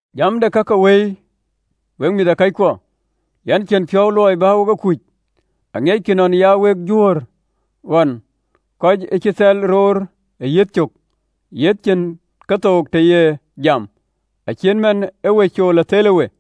Jam de ka ke Wëi, wek Mïthëkɔckuɔ, yɛn cïn piɔ̈u luɔi bä wek e kuc. Aŋiɛckï nɔn ee ya wek Juöör ɣɔn, kɔc ë cï thɛl roor ë yiëth cök, yiëth cïn kethook të ye jam, acït man ee we cool ë thelë we.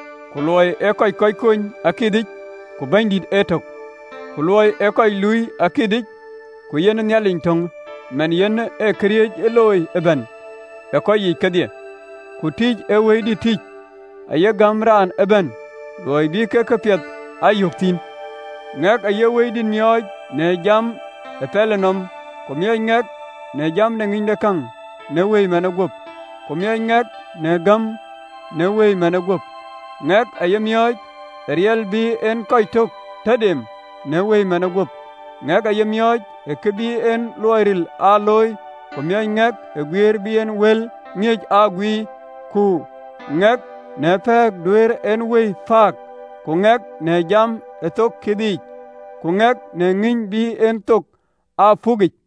Ku luɔi ee kɔc kony akithic, ku Bɛ̈nydït ee tök. Ku luɔi ee kɔc looi akithic, ku yen Nhialic töŋ manë yen ee këriëëc looi ëbɛ̈n ë kɔc yiic kedhie. Ku tïc ee Wëidït tïc aye gäm raan ëbɛ̈n, luɔi bï kɔc këpiɛth aa yök thïn kedhie. Ŋɛk aye Wëidït miɔɔc në jam ë pɛlënɔm, ku miɔɔc ŋɛk në jam de ŋïnydekäŋ, në Wëi manë gup. Ku miɔɔc ŋɛk në gäm, në Wëi manë gup, ŋɛk aye miɔɔc ë riɛl bï en kɔc tök tɔ dem, në Wëi manë gup, ŋɛk aye miɔɔc ë kë bï en luɔi ril aa looi, ku miɔɔc ŋɛk ë guiëër bï en wël ŋiëc aa guiir, ku ŋɛk në pɛ̈ɛ̈k duëër en wëi pääk, ku ŋɛk në jam ë thoŋ kithic, ku ŋɛk në ŋïny bï en thok aa puk yiic.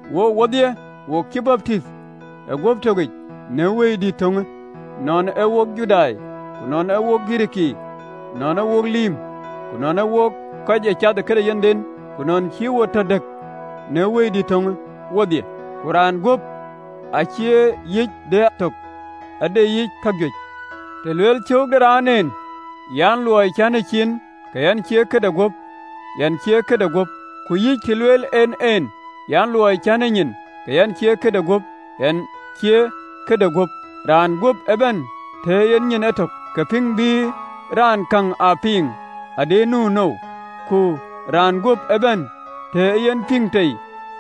Wook wodhie, wo cï baptith ë guöp tökic në Wëidït töŋë, nɔn ee wok Judai, ku nɔn ee wok Girikii, nɔn ee wok lïïm, ku nɔn ee wok kɔc ee cath ë këde yenhden, ku wo cï tɔ dëk në Wëidït töŋë wodhie. Ku raan guöp acïï yic ee tök, ade yic ka juëc. Të lueelë cöök de raan en an, “Luɔi cän ee ciin, ke yɛn cie kë de guöp,” yen cie kë de guöp? Ku yïc, të lueel en en an, “Luɔi cän ee nyin, ke yɛn cie kë de guöp,” yen cïï en ee kë de guöp? Raan guöp ëbɛ̈n, të ee yen nyin etök, ke pïŋ bï raan käŋ aa piŋ nu nou? Ku raan guöp ëbɛ̈n, të ee yen piŋ tei,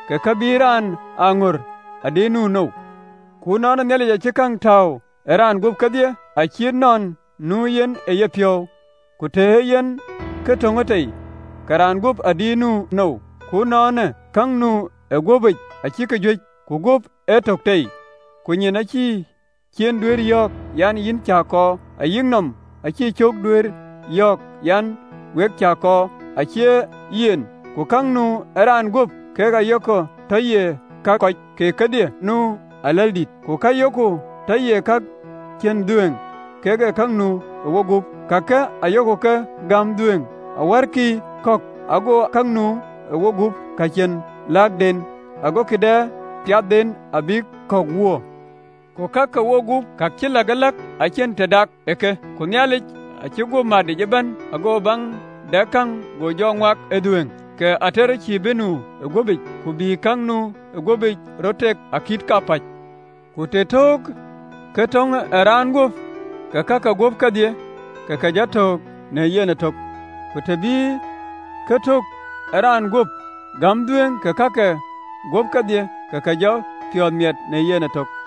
ke kë bï raan aa ŋör adï nu nou? Ku ënɔɔnë, Nhialic acï käŋ tääu ë raan guöp kedhie, acït nɔn nu yen ë yepiɔ̈u. Ku të ee yen kë töŋë tei, ke raan guöp adï nu nou? Ku ënɔɔnë, ka nu ë guöpic acïk juëc, ku guöp ee tök tei. Ku nyin acïï ciin duëër yɔ̈ɔ̈k an, “Yïn cä kɔɔr!” Ayï nɔm, acïï cök duëër yɔ̈ɔ̈k an, “We cä ke kɔɔr!” Acie yen, ku ka nu ë raan guöp ka yok tɔ ye ka kɔ̈c, keek adhilkï nu aläldït: ku ka yok tɔ ye ka cïn dhuëëŋ, kek ka nu ë wogup, kake ayok ke gäm dhuëëŋ awärkï kɔ̈k, ago ka nu ë wogup, ka cïn läkden, agokï dɛ piathden abïk kɔ̈k wöör. Ku ka ke wogup ka cï läkëläk acïn të dak ë ke: ku Nhialic acï guöp matic ëbɛ̈n, ago baŋ dɛk ë käŋ go jɔ ŋuak ë dhuëëŋ. Ke ater cïï bï nu ë guöpic, ku bï ka nu ë guöpic röt tak akït kapäc. Ku të töök ë kë töŋ ë raan guöp, ke ka ke guöp kedhie ke ke jɔ töök në yen ëtök, ku të bï kë tök ë raan guöp gäm dhuëëŋ, ke ka ke guöp kedhie ke ke jɔ piɔ̈ɔ̈th miɛt në yen ëtök.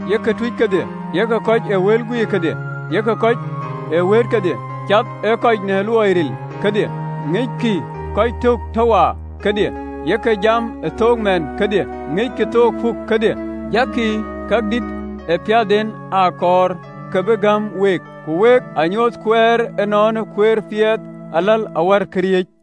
Yek tuuc kedhie? Yek kɔc ee wël guiir kedhie? Yek kɔc ë wëët kedhie? Cath kɔc në luɔi ril kedhie? Ŋickï kɔc tök tɔ waar kedhie? Yek jam ë thook mɛɛn kedhie? Ŋickï thok puk kedhie? Jakï ka dït ë piathden aa kɔɔr, ka bï gäm week. Ku wek aa nyuöth kueer ënɔɔnë kueer piɛth aläl awär këriëëc.